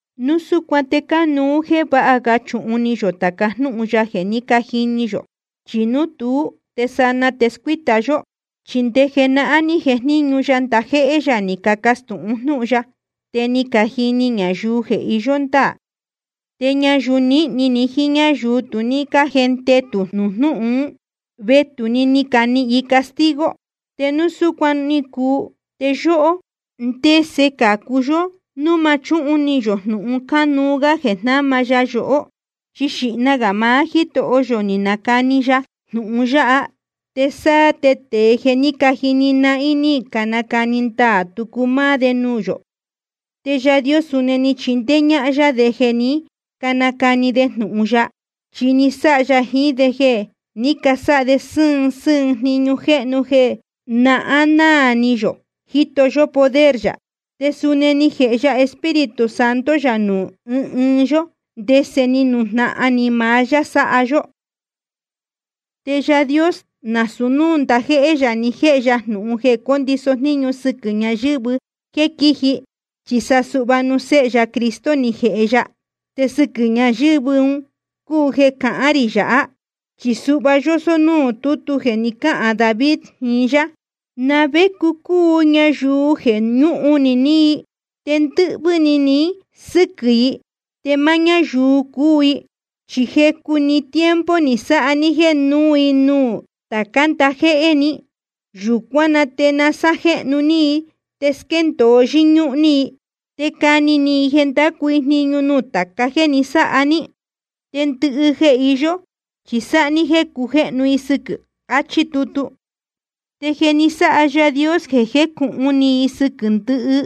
Núu súcuan te cánuú jéē váha ga chuhun ni yō tāca jnúhun ya jeē ní cajini yó, chi núu tuú te sanaa te scuíta yó. Chi nde jenahán ní jejníñu ya ndajéhé yā ni cacastūhun jnúhun ya, te ni cajini ñayuu jeē iyó ndáā. Te ñayuu nīhni ni jiín ñáyuu tu ní cájendetū jnūhun ún, vetū‑ni ni canihīn i castigo. Te núu súcuan ni cuu, te yóhó, ¿ndese cācu yó núu ma chúhun ni yō jnūhun cánuú gá jeē jnáma ya yohó? Chi xīhna gā maá Jítoho yō ni nacani ya jnūhun yáha, te sáá te tēe jeē ní cajini nahín ni canacani ndaā tucu máá de nuū yō. Te Yaā Dios suni ni chindéé ñáhán yá de jeē ní canacani de jnūhun ya. Chi ni sáha ya jiín de jeē ní casáha de sɨ́ɨn sɨ́ɨn jniñu jéhnu jeē nahán náā ni yō jíto yó poder yā. Te suni ni jēhe ya Espíritu Santo yā nuū ɨ́ɨn ɨɨn yó, ndese ni nujnahan ni maá yá sáha yó. Te Yaā Dios nasūu núū ndajéhé yā ni jéhe ya jnūhun jeē condiso jníñu sɨquɨ̄ ñayɨ̄vɨ jéē quíji, chi sa suhva nuū Séhe ya Cristo ni jēhe ya. Te sɨquɨ̄ ñayɨ̄vɨ́ un cúu jeē cahán rī yāhá. Chi suhva yósó núū tútu jeē ni cáhān David jiín yá: ¿Na vé cúu ñayuu jeē ñúhun ni ní i? Te ndɨ́hvɨ́ ni ni sɨ́quɨ̄ i, te máá ñáyuu cúu i. Chi jecu‑ni tiempo ni sáha ní jeē núu i nuū tācá ndajéhé ni. Yūcuán na te sajéhnu ní i te squéndōo yɨ́ñúhún ní i, te cani ní i jeē ndacu i jniñu nuū tāca jéē ni sáha ní. Te ndɨhɨ jeē iyó chi sáha ní jéē cujéhnu i sɨquɨ̄. Achí tutu. Te jeē ni sáha Yaā Dios jeē cujéhnu i sɨquɨ̄ ndɨhɨ,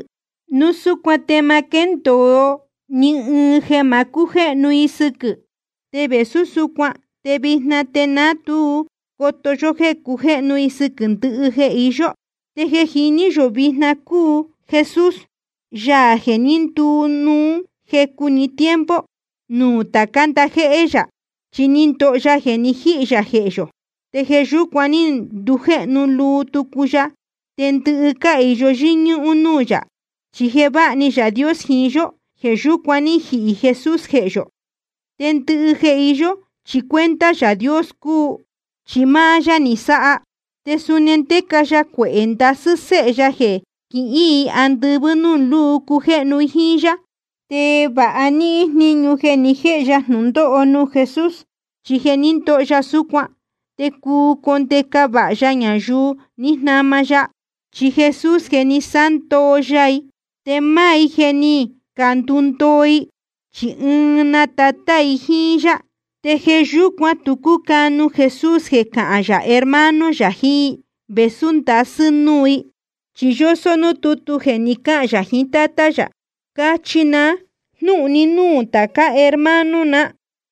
núu súcuan te ma quéndōo ni ɨɨn jeē ma cújéhnu i sɨquɨ̄. Te vēsú súcuan te vijna te ná tu coto yó jéē cujéhnu i sɨquɨ̄ ndɨhɨ jeē iyó. Te jeē jiní yō vijna cúu Jesús, Yaā jeē ní nduu núu jecu‑ni tiempo nuū tācá ndajéhé yā. Chi ni ndoho ya jeē ni jíhī yā jehē yō, te jeē yúcuan ní ndujéhnu luu tucu ya, te ndɨhɨ cáhīyo yɨ́ñúhún núū yā. Chi jeē váha ni Yaā Dios jiín yó, jeē yúcuan ní jihī Jesús jehē yō. Te ndɨhɨ jeē iyó chi cuenta Yaā Dios cúu, chi máá yá ni sáha. Te suni ndéca ya cuehē ndasɨ́ séhe ya jeē quihín i andɨvɨ́ núū luu cujéhnu i jíín yá. Te vāha níhín jníñu jeē ni jéhe ya jnūndóho nuū Jesús, chi jeē ní ndoho ya súcuan te cuu condeca vāha ya ñayuu ní jnama ya. Chi Jesús jeē ni sándoo ya i te máá i jeē ní candundoo i, chi ɨɨn‑ni Tátá i jíín yá. Te jeē yúcuan tu cúcanu Jesús jeē cahán yā hermano yā jiín i, vēsú ndasɨ́ núu i. Chi yósó núū tútu jeē ni cáhān yā jiín Tátá yā: Cachi na jnúhun ní núū tācá hermano na,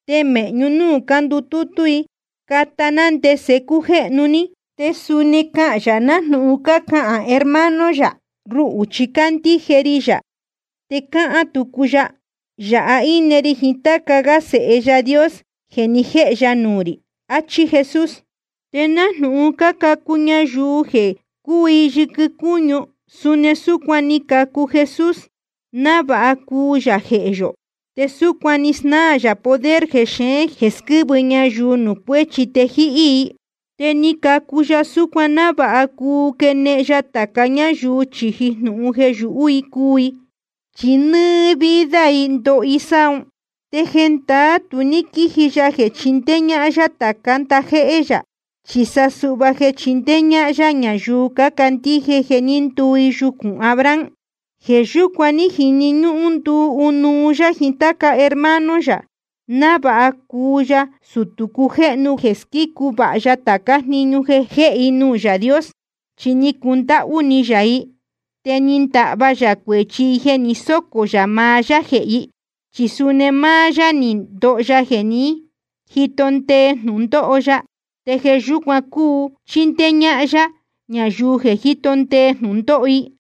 te mēhñu núū cándutútú i cata ná ndese cújéhnu ní. Te suni cáhán yā nájnūhun cácahān hermano yā: Ruhū chi cándíje ri yā. Te cáhán tucu yā: Yāha íne ri jiín táca gá sēhe Yaā Dios jeē ni jéhe ya nuū rī. Achí Jesús. Te nájnūhun cácacu ñayuu jeē cúu i yɨquɨ cúñu, suni súcuan ni cacu Jesús, návāha cuu yā jehē yō. Te súcuan ni snáā yā poder jexeén jeē squɨ́vɨ ñayuu nuū cuéchi te jíhí i. Te ni cacu ya súcuan návāha cuu quenehen ya tāca ñáyuu chīji jnūhun jeē yuhú i cuu i. Chi nɨ́ɨ́ vida i ndóho i sáha ún. Te jendaá tu ní quíji ya jeē chindéé ñáhán yá tācá ndajéhé yā, chi sa suhva jeē chindéé ñáhán yá ñayuu cácandíje jeē ní nduu yucūn Abraham. Jeē yúcuan ní jini ñúhún nduu ɨnuú yá jiín táca hermano yā, návāha cuu ya sutū cujéhnu jeē squícu vāha ya tācá jniñu jehē i nuū Yaā Dios. Chi ni cundáhú ni yā i, te ni ndahva yā cuēchi i jeē ni sócō yā maá yá jehē i. Chi suni máá yá ni ndoho ya jeē ní jito ndee jnūndóho ya, te jeē yúcuan cuu chindéé ñáhán yá ñayuu jeē jíto ndee jnūndóho i.